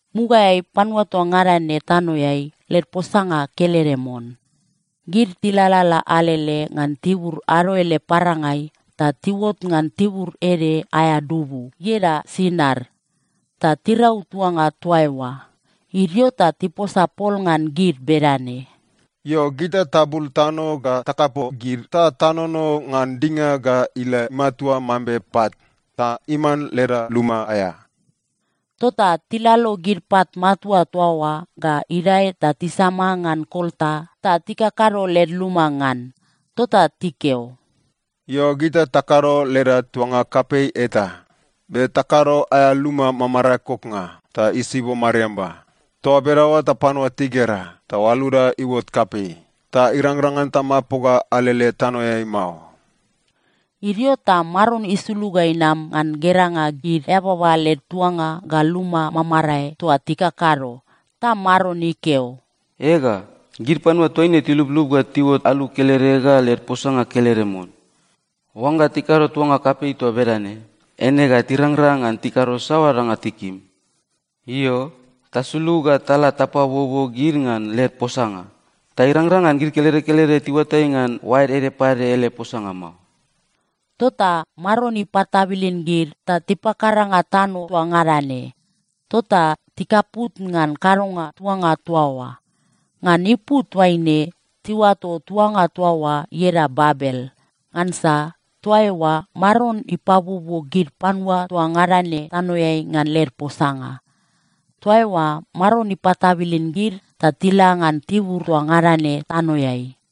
Mugaeai panua toa ngada ne tanoeai led posanga kelede mon. Gid tilalala alele ngan tibur ado ele parangai ta tiuot ngan tibur ede aea dubu, ieda Sinar, ta tirau tuanga toa eoa. Idio ta tiposa pol ngan gid bedane, “Io, gita tabul tano ga takapo gid ta tanono ngan dinga ga ila matua mambe pat, ta iman leda luma aea.” Tota tilalo gid pat matua toa oa ga idae ta tisama ngan kolta ta tikakado led luma ngan. Tota tikeo, “Io, gita takado leda tuanga kapei eta be takado aea luma mamarae koknga ta isibo mariamba. Toa bedaoa ta panua tigera ta oaluda iuot kapei, ta irangrang ngan tamapoga alele tanoeai mao.” Idio ta Maron isulug ga inam ngan geranga gid eababa led tuanga ga luma mamarae toa tikakado. Ta Maron ikeo, “Ega, gid panua toaine tiluplup ga tiuot alu kelede ga led posanga kelede mon. Oangga tikado tuanga kapei toa bedane, eine ga tirangrang ngan tikado saoa danga tikim. Io, tasulug ga tala tapabuobuo gid ngan led posanga, ta irangrang ngan gid kelede kelede tiuatai ngan oaed ede pade ele posanga mao.” Tota Maron ipatabilin gid ta tipakaranga tano toa ngada ne. Tota tikaput ngan kadonga tuanga toa oa. Ngan ipu toaine tiuato tuanga toa oa ieda Babel. Ngansa toa eoa Maron ipabuobuo gid panua toa ngada ne tanoeai ngan led posanga. Toa eoa Maron ipatabilin gid ta tila ngan tibur toa ngada ne tanoeai.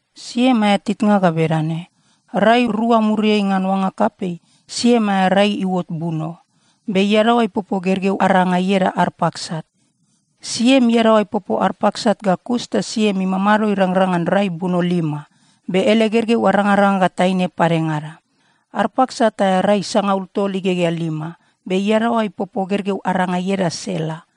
Siem aea titnga ga bedane: Rai rua muriai ngan oanga kapei, Siem aea rai iuot buno, be iadaoa ipopo gergeu aranga ieda Arpaksat. Siem iadaoa ipopo Arpaksat ga kus ta Siem imamado irangrang ngan rai buno lima. Be ele gergeu arangaranga ga taine padengada. Arpaksat aea rai sangaul tol igegea lima, be iadaoa ipopo gergeu aranga ieda Sela.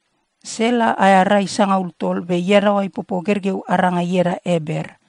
Sela aea rai sangaul tol, be iadaoa ipopo gergeu aranga ieda Eber.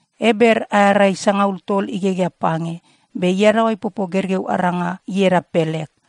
Eber aea rai sangaul tol igegea pange, be iadaoa ipopo gergeu aranga ieda Pelek.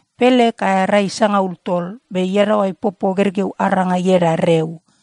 Pelek aea rai sangaul tol, be iadaoa ipopo gergeu aranga ieda Reu.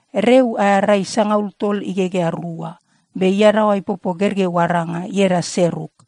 Reu aea rai sangaul tol igegea rua, be iadaoa ipopo gergeu aranga ieda Seruk.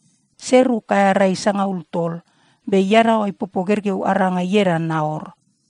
Seruk aea rai sangaul tol, be iadaoa ipopo gergeu aranga ieda Naor.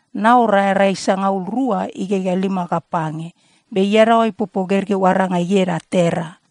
Naor aea rai sangaul rua igegea lima ga pange, be iadaoa ipopo gergeu aranga ieda Tera.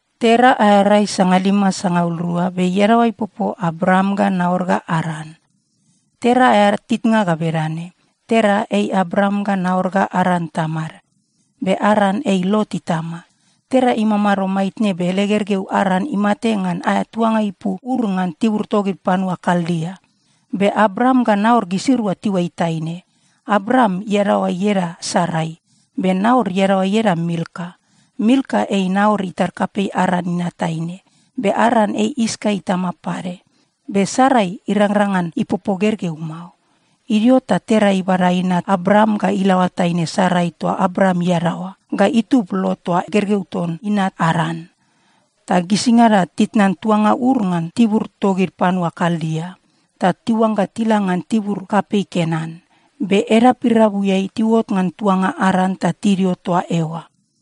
Tera aea rai sangalima sangaul rua, be iadaoa ipopo Abram ga Naor ga Aran. Tera aea titnga ga bedane: Tera ei Abram ga Naor ga Aran tamad. Be Aran ei Lot itama. Tera imamado maitne, be ele gergeu Aran imate ngan aea tuanga ipu Ur ngan tibur togid panua Kaldia. Be Abram ga Naor gisirua tiuai taine. Abram iadaoa ieda Sarai, be Naor iadaoa ieda Milka. Milka ei Naor itar kapei Aran inat taine. Be Aran ei Iska itama pade. Be Sarai irangrang ngan ipopo gergeu mao. Idio ta Tera ibada inat Abram ga ilaoa taine Sarai toa Abram iadaoa, ga itub Lot toa gergeu ton inat Aran, ta gisingada titnan tuanga Ur ngan tibur togid panua Kaldia, ta tiuangga tila ngan tibur kapei Kenan. Be edap irabuiai tiuot ngan tuanga Aran ta tidio toa eoa.